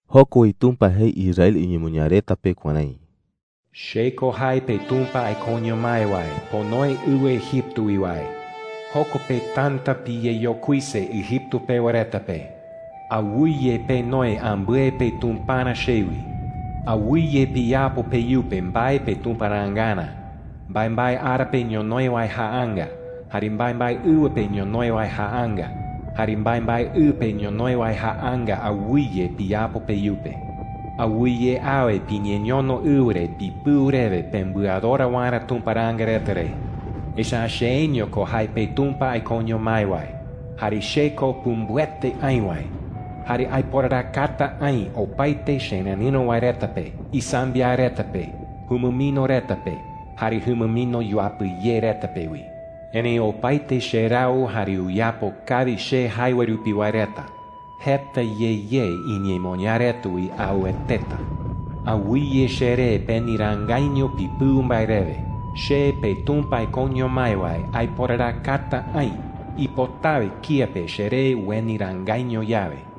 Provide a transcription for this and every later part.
Joko wi Tumpa jei Israel iñemoñaa reta pe kuärái: “Che ko jae peTumpa aikoño mái wae ponoe ɨwɨ Egipto wi wae. Joko pe täta piyeyokuise Egipto pewa reta pe,” jei. “Awɨye penoi ambɨe petumparä chewi,” jei. “Awɨye piyapo peyupe mbae petumparaangarä – mbaembae ara pe ñonoï wae jaanga, jare mbaembae ɨwɨ pe ñonoï wae jaanga, jare mbaembae ɨ pe ñonoï wae jaanga awɨye piyapo peyupe. Awɨye awe piñeñono ɨwɨ re pipɨu rewe pembɨadora waerä tumparaanga reta re. Echa’ä cheeño ko jae peTumpa aikoño mái wae, jare che ko pumbɨete aï wae. Jare aiporarakata aï opaete chererɨ̈ro wae reta pe, isambiaɨ reta pe, jumɨmino reta pe, jare jumɨmino yuapɨ ye reta pe wi,” jei. “Erëi opaete cherau jare uyapo kawi che jae wae rupi wae reta, jeta ye ye iñemoñaa reta wi aueteta,” jei. “Awɨye cheree peniraangaiño pipɨu mbae rewe. Che, peTumpa aikoño mái wae, aiporarakata aï ipotawe kía pe cheree ueniraangaiño yawe,” jei.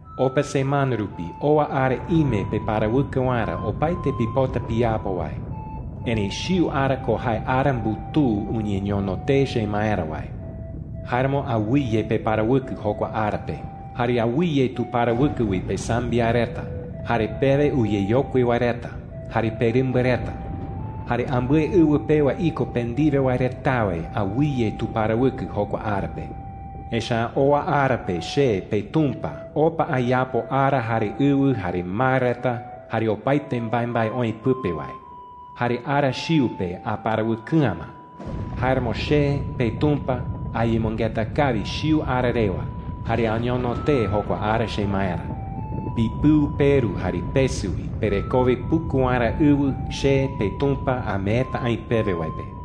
Opa semana rupi, owa ara ime peparawɨkɨ waerä opaete pipota piyapo wae. Erëi chiu ara ko jae ara mbutuu uñeñono tee chemaerä wae. Jáeramo awɨye peparawɨkɨ jokua ara pe. Jare awɨye tuparawɨkɨ wi pesambiaɨ reta, jare pewe uyeyokui wae reta, jare perɨmba reta. Jare ambɨe ɨwɨ pewa iko pe ndiwe wae retawe awɨye tuparawɨkɨ jokua ara pe. Echa’ä owa ara pe che, peTumpa, opa ayapo ara, jare ɨwɨ, jare mar reta, jare opaete mbaembae oï pɨpe wae. Jare ara chiu pe aparawɨkɨ'ä ma. Jáeramo che, peTumpa, ayemɨngeta kawi chiu ara rewa jare añono tee jokua ara chemaerä,” jei. “Pipɨu peru jare pesɨ wi, perekowe puku waerä ɨwɨ che, peTumpa, ameeta aï pewe wae pe,” jei.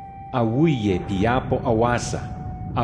“Awɨye piyapo awasa,” jei.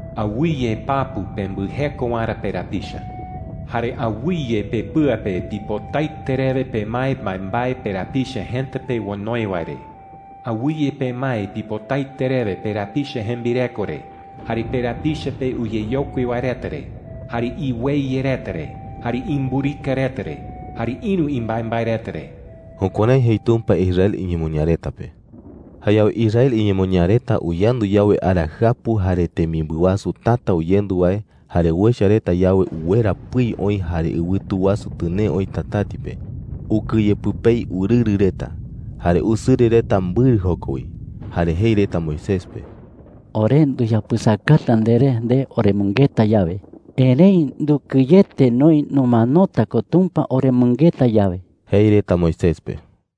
“Awɨye papu pembɨjeko waerä perapicha,” jei. “Jare awɨye pepɨa pe pipotaete rewe pemae mbaembae perapicha jëta pe onoi wae re. Awɨye pemae pipotaete rewe perapicha jembireko re, jare perapicha pe uyeyokui wae reta re, jare iweye reta re, jare imburika reta re, jare ïru imbaembae reta re.” Jukuärái jei Tumpa Israel iñemoñaa reta pe. Jayawe Israel iñemoñaa reta uyandu yawe ara jɨapu jare temimbɨ wasu täta uyendu wae, jare uecha reta yawe uwera pɨi oï jare ɨwɨtu wasu tɨnee oï tatäti pe, ukɨye pɨpei urɨrɨ reta. Jare usɨrɨ reta mbɨrɨ joko wi. Jare jei reta Moisés pe: “Ore nduyapɨsakata nderé nde oremɨngeta yawe,” jei. “Erëi ndukɨyete noï numanota ko Tumpa oremɨngeta yawe,” jei reta Moisés pe.